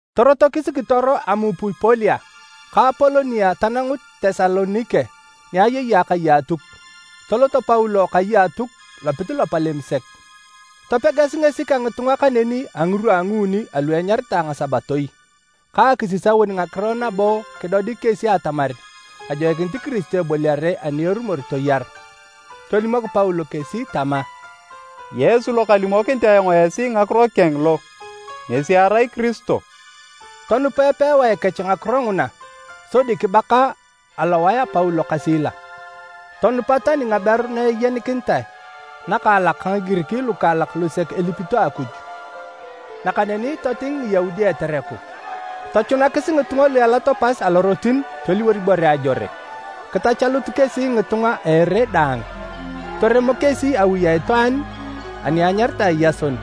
Torotokis kitoro Amupipolia ka Apolonia tanangut Tesalonike ni ayei akai a Atuk. Tolot Paulo kai a Atuk lopit lopalem sek. Topegas ngesi ka ngitunga kaneni a ngirwa a nguuni alu enyaritae ngasabatoi ka akisisaun ngagiran nabo kidodik kesi atamar ajoikinit Kiristo eboliare ani erumor toyaru. Tolimok Paulo kesi tama, “Yesu lo kalimokinit ayong esi ngakiro keng lo, ngesi erai Kiristo.” Tonupa epewae kech ngakiro nguna sodi kibaka alowae a Paulo ka Sila. Tonupa tani ngaberu na ayenikinitae nakaalak ka Ngigirik lukaalak lusek elipito Akuj. Nakaneni toting Ngiyaudi etereku. Tochunakis ngitunga lu elato pas alorotin toliwor ibore ajore. Kitachalut kesi ngitunga a ere daang. Toremo kesi awi a itwaan ani enyaritae Yason,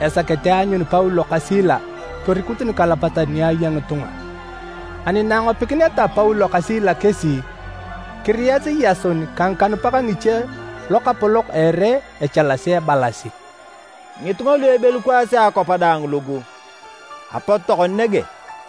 esakete aanyun Paulo ka Sila torikut nikalapatan ni aya ngitunga. Ani na angopikineta Paulo ka Sila kesi, kiriyasi Yason ka ngikanupak ngiche lokapolok a ere echalasi ebalasi, “Ngitunga lu ebelukwaasi akwap daang lugu, apot tokona nege.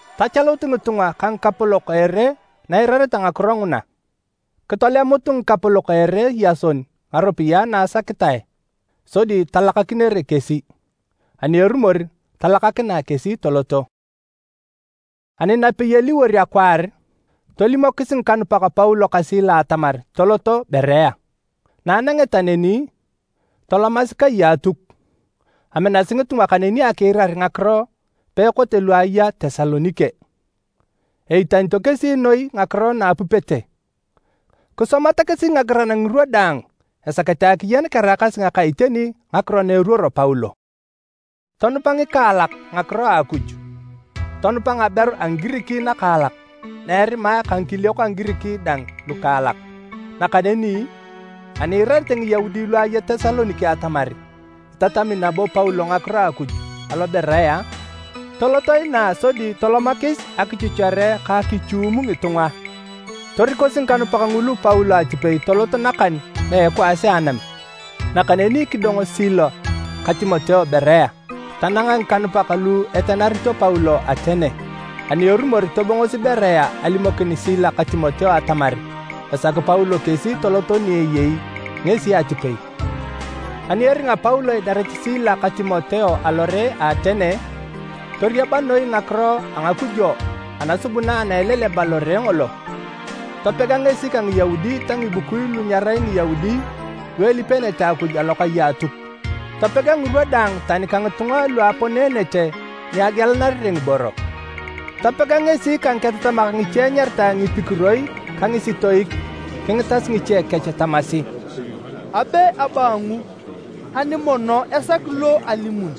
Tachalut ngitunga ka ngikapolok a ere na eirareta ngakiro nguna. Kitolemut ngikapolok a ere Yason ngaropiyae na asakitae sodi talakakinere kesi, ani erumor, talakakinae kesi toloto. Ani napei eliwor akwaar, tolimokis ngikanupak Paulo ka Sila atamar toloto Berea. Na anangeta neni, tolomasi kai a Atuk. Aminasi ngitunga kaneni akiirar ngakiro peekote lu aya Tesalonike. Eitanito kesi noi ngakiro na apupete. Kisomata kesi ngagiran ngirwa daang esakete akiyen keraakasi ngaka iteni ngakiro na eruoro Paulo. Tonupa ngikaalak ngakiro a Akuj. Tonupa ngaberu a Ngigirik nakaalak na erimae ka ngikiliok a Ngigirik dang lukaalak. Nakaneni ani iirarete Ngiyaudi lu aya Tesalonike atamar itatami nabo Paulo ngakiro a Akuj alo Berea, toloto inaa sodi tolomakis akichuchere ka akichuum ngitunga. Torikosi ngikanupak ngulu Paulo atipei tolot nakan na a ekwaas a anam. Nakaneni kidongo Sila ka Timoteo Berea. Tananga ngikanupak lu etenarito Paulo Atene. Ani erumor tobongosi Berea alimokin Sila ka Timoteo atamar esaki Paulo kesi toloto ni eyei ngesi atipei. Ani eringa Paulo idarit Sila ka Timoteo alo Atene, toriaba noi ngakiro a ngakujo anasubuna ana eleleba lore ngolo. Topega ngesi ka Ngiyaudi ta ngibukui lu nyerai Ngiyaudi lu elipeenete Akuj alokai a Atuk. Topega ngirwa daang tani ka ngitunga lu aponeenete ni agielanarere ngiboro. Topega ngesi ka ngiketatamak ngiche enyaritae Ngipikuro ka Ngisitoik kingitas ngiche kech tamasi, “Abe abaangu ani mono esaki lo alimun?”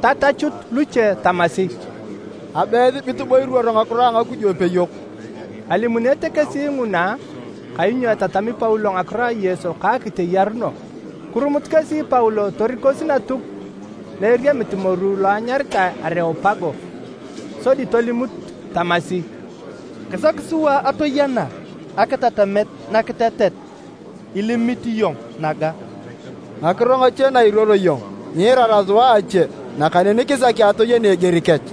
Tatachut luche tamasi, “Abe esibit bo iruoro ngakiro a ngakujo peyok.” Alimuunete kesi nguna kainyo etatami Paulo ngakiro a Yesu ka akiteyaruno. Kirumut kesi Paulo torikosi Natuk na eriamit moru lo enyaritae Areopago. Sodi tolimut tamasi, “Kisaki sua atoyena akitatamet nakitetet ilimit iyong naga. Ngakiro ngache na iruoro iyong, nyiirara sua a ache nakaneni kisaki atoyena eger kech.” (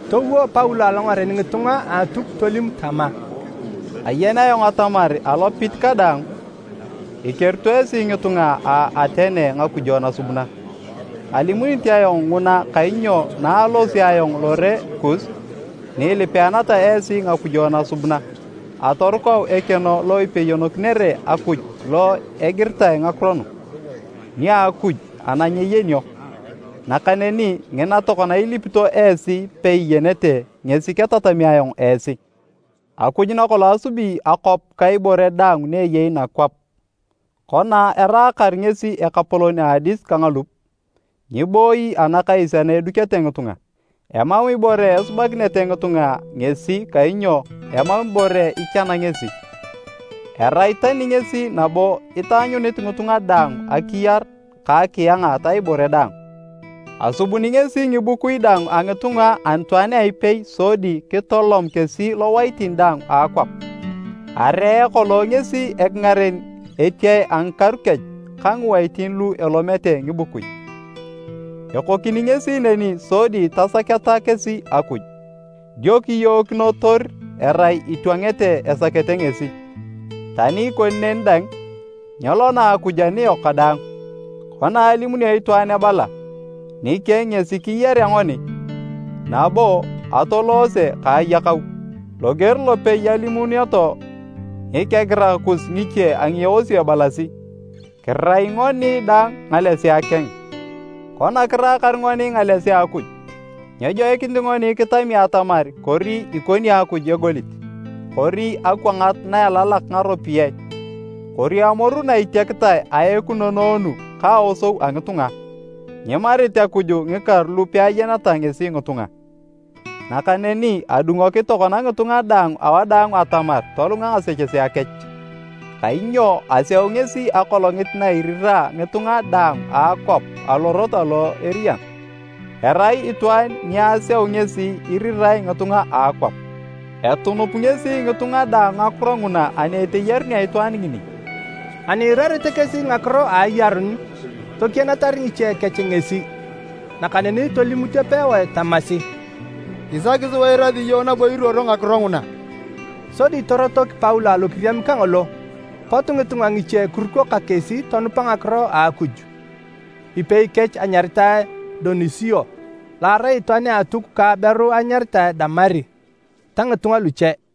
Towo Paulo alongaren ngitunga a Atuk tolim tama, “Ayen ayong atamar alopit kadaang, ikerito esi ngitunga a Atene ngakujo nasubuna. Alimunit ayong nguna kainyo na alosio ayong alore kus, ni ilipeeneta esi ngakujo nasubuna, atorukau ekeno lo ipeyonokinere Akuj lo egiritae ngakiro nu, ‘NIA AKUJ ANA NYEYENIO.’ Nakaneni ngina tokona ilipito esi peiyenete ngesi ketatami ayong esi. Akuj nakolong asubi akwap ka ibore daang ni eyei nakwap, kona eraakar ngesi Ekapolon a adis ka ngalup, nyibooyi anakais ana edukete ngitunga. Emam ibore esubanakinete ngitunga ngesi kainyo emam ibore ichana ngesi. Erai tani ngesi nabo itaanyunit ngitunga daang akiyar ka akianga ta ibore daang. Asubuni ngesi ngibukui daang a ngitunga anitwaan a ipei sodi kitolom kesi lowaitin daang a akwap. Aree kolong ngesi ekingaren etiae a ngikaru kech ka ngiwaitin lu elomete ngibukui. Ekokini ngesi neni sodi tasaketa kesi Akuj, dio kiyookinotor erai itwangete esakete ngesi. Tani ikoni neni dang, nyelona Akuj aniyok kadaang, kona alimunio itwaan ebala, ‘Nikeng ngesi kiyarea ngoni, nabo atoloose ka ayakau.’ Loger lopei alimunioto ngikegirak kus ngiche a ngieosio ebalasi, ‘Kirai ngoni dang ngalesea keng.’ Kona kiraakar ngoni ngalesea a Akuj, nyejoikinit ngoni kitami atamar kori ikoni Akuj egolit, kori akwangat na elalak ngaropiyae kori amoru na itiakitae a ekunonoonu ka aosou a ngitunga. Nyimarit Akuj ngikaru lu peayeneta ngesi ngitunga. Nakaneni adungoki tokona ngitunga daang awadaang atamar tolunga ngasechesea kech. Kainyo aseu ngesi akolongit na irira ngitunga daang a akwap alorot alo eriyan. Erai itwaan ni aseu ngesi irirae ngitunga a akwap. Etunup ngesi ngitunga daang ngakiro nguna ani eteyarunea itwaan ngini!” Ani iirarete kesi ngakiro a ayaruni, tokienatar ngiche kech ngesi, nakaneni tolimut epewae tamasi, “Kisaki sua eirasi iyong nabo iruoro ngakiro nguna.” Sodi torotok Paulo alokiriam kangolo. Pot ngitunga ngiche kiruko ka kesi tonupa ngakiro a Akuj. Ipei kech anyaritae Donisio lo arai itwaan a Atuk ka aberu enyaritae Damari ta ngitunga luche.